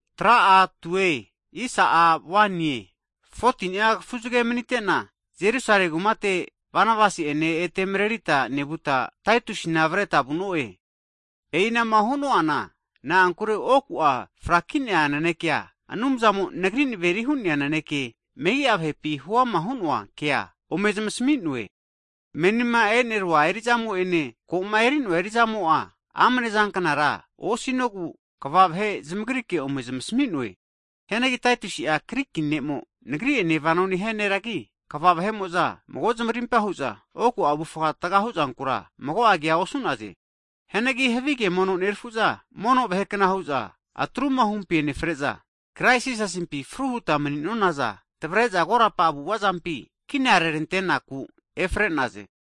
Hagi 14ni'a kafuzage manite'na, Jerusalemi kumate Banabasi'ene ete marerita nevuta, Taitusina avreta vu'no'e. E'inama hu'noana na'ankure oku'a fraki'nea nanekea, Anumzamo nagri naveri hu'nea naneke megi'a vahepi huama hu'noa kea ome zmasami'noe. Menima e'nerua erizamo'ene, ko'ma eri'noa eri'zamo'a amnezanknara osinogu kva vahe zamagrike ome zamasami'noe. Hianagi Taitusi'a Griki ne'mo nagri'ene vano nehia neragi, kva vahe'mo'za mago zamarimpa hu'za, oku avufga anona taga huzankura mago kea osu'naze. Hianagi havige mono nerafu'za mono vahekna hu'za atrumahumpina enefre'za, Krais Jisasimpi fruhuta mani'nonazana tavre'za korapa avu'avazampi kinarerante'naku efre'naze.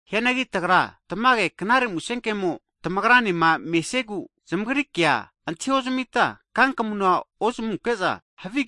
Hianagi tagra tamage Knare Musenkemo tamagrane mesiegu, zamagri kea antahiozamita kankamuna ozami'none.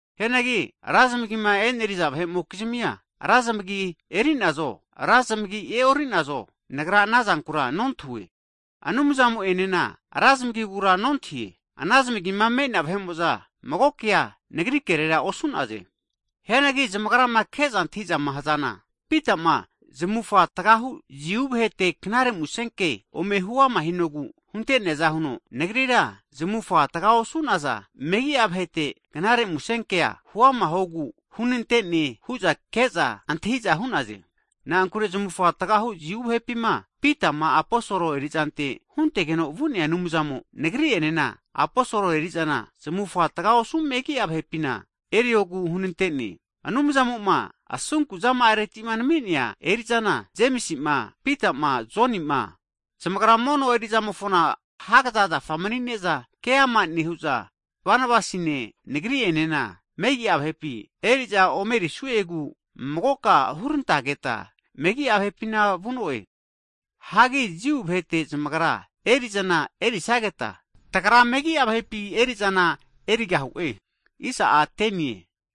Hianagi ra zamagi eri'naza vahe'mokizmia, ra zamagima eri'nazo, ra zmagi e'ori'nazo nagra ana zankura nontahue. Anumzamo'enena ra zmagigura nontahie. Ana zamagima me'nea vahe'mo'za mago kea nagri kerera osu'naze. Hianagi zamagrama ke'za antahizama hazana, Pitama zamufga tgahu Jiu vahete Knare Musenke ome huama hinogu hunte'neaza huno, nagrira zamufga taga osu'naza megi'a vahete Knare Musenkea huama huogu hunante'ne hu'za ke'za antahiza hu'naze. Na'ankure zamufga tagahu Jiu vahepima Pitama aposol erizante huntegeno vu'nea Anumzamo, nagri'enena aposolo eri'zana zamufga taga osu megi'a vahepina eriogu hunante'ne. Anumzamo'ma asunkuzama'areti nami'nea eri'zana, Jemisima, Pita'ma, Joni'ma zamagra mono eri'zamofona hagaza zafa mani'ne'za keama nehu'za, Banabasine nagri'enena megi'a vahepi eri'za omerisu'egu magoka hurantageta megi'a vahepina vu'no'e. Hagi Jiu vahete zamagra eri'zana erisageta, tagra megi'a vahepi eri'zana erigahu'e.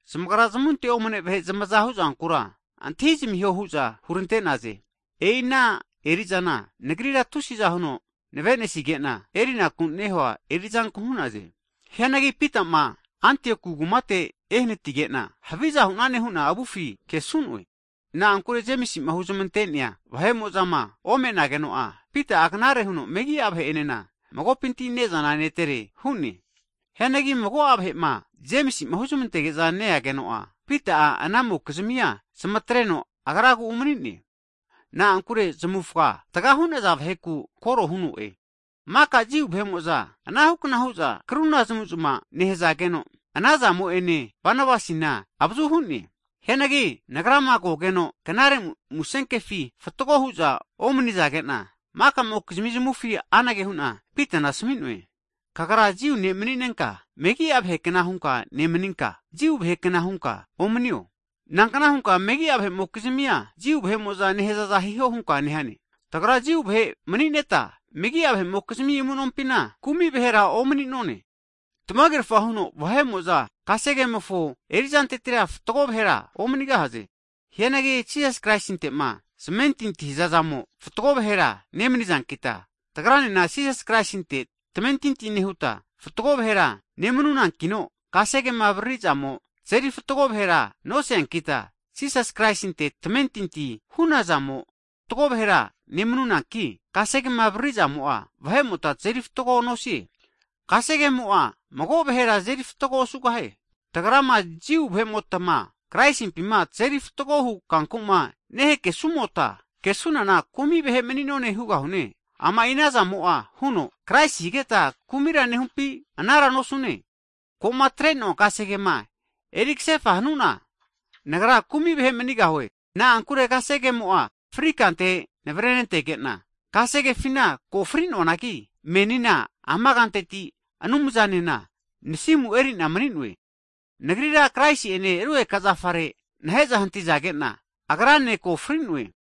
Zamagra zamunte omane vahe zamaza huzankura antahizamiho hu'za hurante'naze. E'i ana eri'zana nagrira tusi'za huno navenesige'na erinaku nehua erizanku hu'naze. Hianagi Pita'ma Antioku kumate ehanatige'na, haviza hu'nane hu'na avufi kesu'noe. Na'ankure Jemisi'ma huzmante'nea vahe'mo'zama omenageno'a, Pita'a knare huno megi'a vahe'enena magopinti ne'zana netere hu'ne. Hianagi mago'a vahe'ma Jemisi'ma huzmantege'za neageno'a, Pita'a anamokizmia zamatreno agragu umani'ne. Na'ankure zamufga taga hu'naza vaheku koro hu'ne. Maka Jiu vahe'mo'za, anahukna hu'za kruna zamuzma nehazageno, ana zamo'enena, Banabasina avazu hu'ne. Hianagi nagrama kogeno, Knare Musenkefi fatgo hu'za omanizage'na, maka'mokizmi zamufi anage hu'na Pitana asmi'noe, kagra Jiu ne' mani'nenka megi'a vahekna hunka nemaninka, Jiu vahekna hunka nomanine. Nankna hunka megi'a vahe'mokizmia, Jiu vahe'mo'za nehazaza hiho hunka nehane? Tagra Jiu vahe mani'neta, megi'a vahe'mokizmi amu'nompina, kumi vahera omani'none. Tamagerafa hu'za vahe'mo'za kasegemofo erizantetira fatgo vahera omanigahaze. Hianagi Jisas Kraisinte'ma zamentintima hazamo'za fatgo vahera nemanizankita, tagranena Jisas Kraisinte tamentinti nehuta fatgo vahera nemnunankino, kasegema avaririzamo tazeri fatgo vahera noseankita, Jisas Kraisinte tamentinti hanunazamo fatgo vahera nemnunanki, kasegema avaririzamo'a vahe'mota tazeri fatgo nosie. Kasegemo'a mago vahera azeri fatgo osugahie. Tagrama Jiu vahe'motama Kraisimpima tazeri fatgo hu kanku'ma nehakesumota, kesunana kumi vahe mani'none hugahune. Ama'i ana zamo'a huno Kraisi higeta kumira nehumpi? Anara nosune. Ko'ma atre'noa kasegema eri kasefa hanu'na, nagra kumi vahe manigahue. Na'ankure kasegemo'a fri kante navrentege'na, kasegefina ko fri vahekna hu'na mani'noanagi, menina ama kanteti Anumzanena nasimu eri'na mani'noe. Nagrira Kraisi'ene rugeka zafare nahe'za hantizage'na, Agrane ko fri'noe.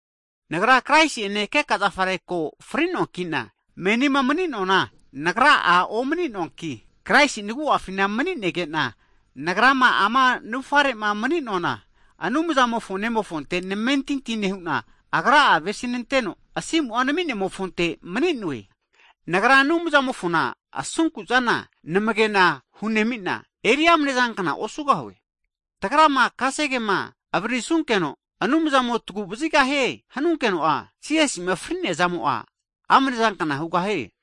Nagra Kraisi'ene keka zafare ko fri'noankina, menima mani'noana nagra'a omani'noanki, Kraisi nagu'afina mani'negena, nagrama ama navufare'ma mani'noana, Anumzamofo Nemofonte namentinti nehu'na Agra'a avesinanteno asimu'a nami'nemofonte mani'noe. Nagra Anumzamofo asunku'zana namage'na hunemi'na eri amnezanknara osugahue. Tagrama kasegema avaririsunkeno, Anumzamo'a taguvazigahie hanunkeno'a, Jisasi'ma frino tazeri agruma hu'neazamo'a amnezankna hugahie.